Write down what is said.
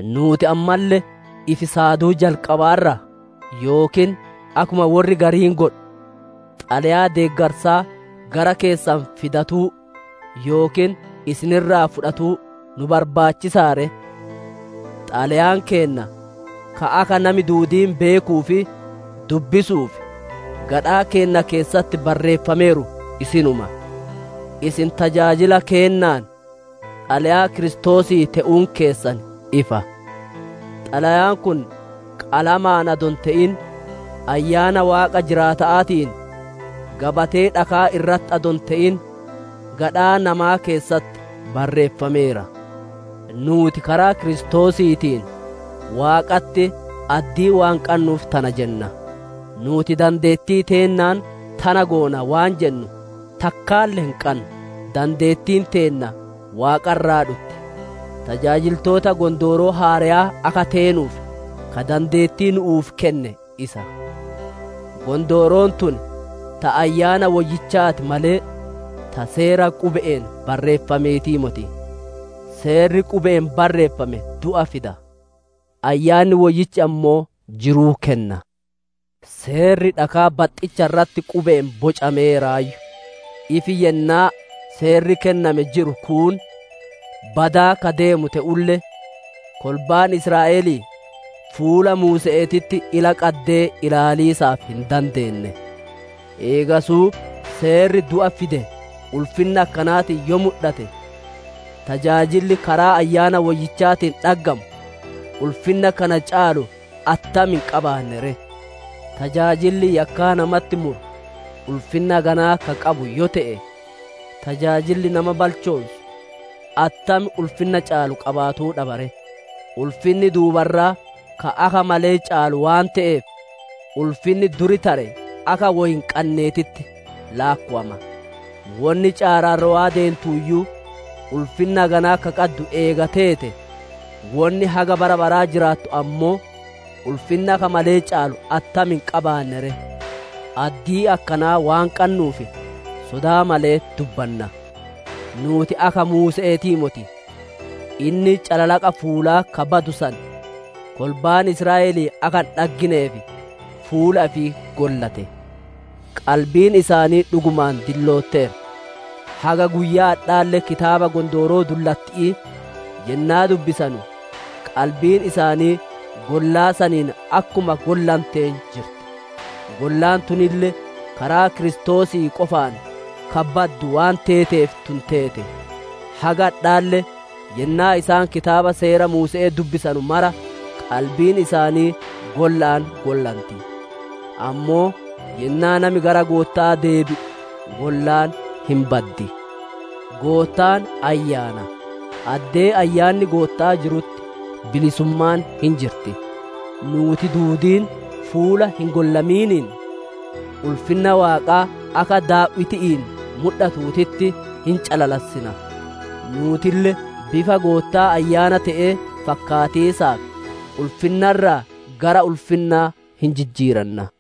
Nuuti ammalle ifi saaduu jalqabaarraa? Yookiin akkuma worri gariin godhu xalayaa deeggarsaa gara keessan fidatuu yookiin isin irraa fudhatuu nu barbaachisaa ree? Xalayaan keenna ka akka nami duudiin beekuu fi dubbisuuf gadhaa keenna keessatti barreeffameeru isinuma. Isin tajaajila keennaan xalayaa Kiristoosii te'uun keessan ifa. Xalayaan kun hallu'uun adoo hin te'in, Ayyaana Waaqa jiraata'aatiin, gabatee dhaka'aa irratti adoo hin te'in gadhaa namaa keessatti barreeffameera. Nuuti karaa Kiristoosiitiin Waaqatti addii waan qannuuf tana jenna. Nuuti dandeettii teennaan tana goona waan jennu takkaalle hin qannu; dandeettiin teenna Waaqa irraa dhutti. Tajaajiltoota Gondooroo Haareyaa akka teenuuf ka dandeetti nu'uuf kenne isa; gondooroon tun ta Ayyaana Woyyichaati malee, ta seera qube'een barreeffameetii moti. Seerri qube'een barreeffame du'a fida; Ayyanni Woyyichi ammoo jiruu kenna. Seerri dhakaa baxxicha irratti qube'een bocameeraayyu; ifi yennaa seerri kenname jiru kuun badaa ka deemu te'ulle, kolbaan Israa'elii fuula muuse'eetitti ila qaddee ilaaliisaaf hin dandeenne. Eegasuu seerri du'a fide ulfinna akkanaatiin yoo mudhate, tajaajilli karaa Ayyaana Woyyichaatiin dhaggamu ulfinna kana caalu attam hin qabaanne ree? Tajaajilli yakkaa namatti muru ulfinna haganaa ka qabu yoo te'e, tajaajilli nama balchoonsu attam ulfinna caalu qabaatuu dhaba ree? Ulfinni duuba irraa ka akka malee caalu waan te'eef, ulfinni dur tare akka woy hin qanneetitti laakkowama. Wonni caararrowaa deentuuyyuu ulfinna haganaa ka qaddu eega teete, wonni haga bara baraa jiraatu ammoo ulfinna akka malee caalu attam hin qabaanne ree? Addii akkanaa waan qannuuf, sodaa malee dubbanna. Nuuti akka muuse'eetii moti; inni calalaqa fuulaa ka badu san kolbaan Israa'elii akka hin dhaggineef fuula ifii gollate. Qalbiin isaanii dhugumaan dillootteerti; haga guyyaa adhaalle kitaaba Gondooroo Qaraa yennaa dubbisanu qalbiin isaanii gollaa saniin akkuma gollanteen jirti. Gollaan tunille karaa Kiristoosii qofaan ka baddu waan teeteef tun teete. Haga adhaalle yennaa isaan kitaaba Seera Muuse'ee dubbisanu mara, qalbiin isaanii golla'aan gollanti. Ammoo yennaa nami gara Gootta'aa deebi'u gollaan hin baddi. Goottaan Ayyaana; addee Ayyaanni Gootta'aa jirutti bilisummaan hin jirti. Nuuti duudiin fuula hin gollamiiniin, ulfinna Waaqaa akka daaw'iti'iin mudhatuutitti hin calalassina; nuutille bifa Goottaa Ayyaana te'ee fakkaatiisaaf ulfinna irraa gara ulfinna hin jijjiiranna.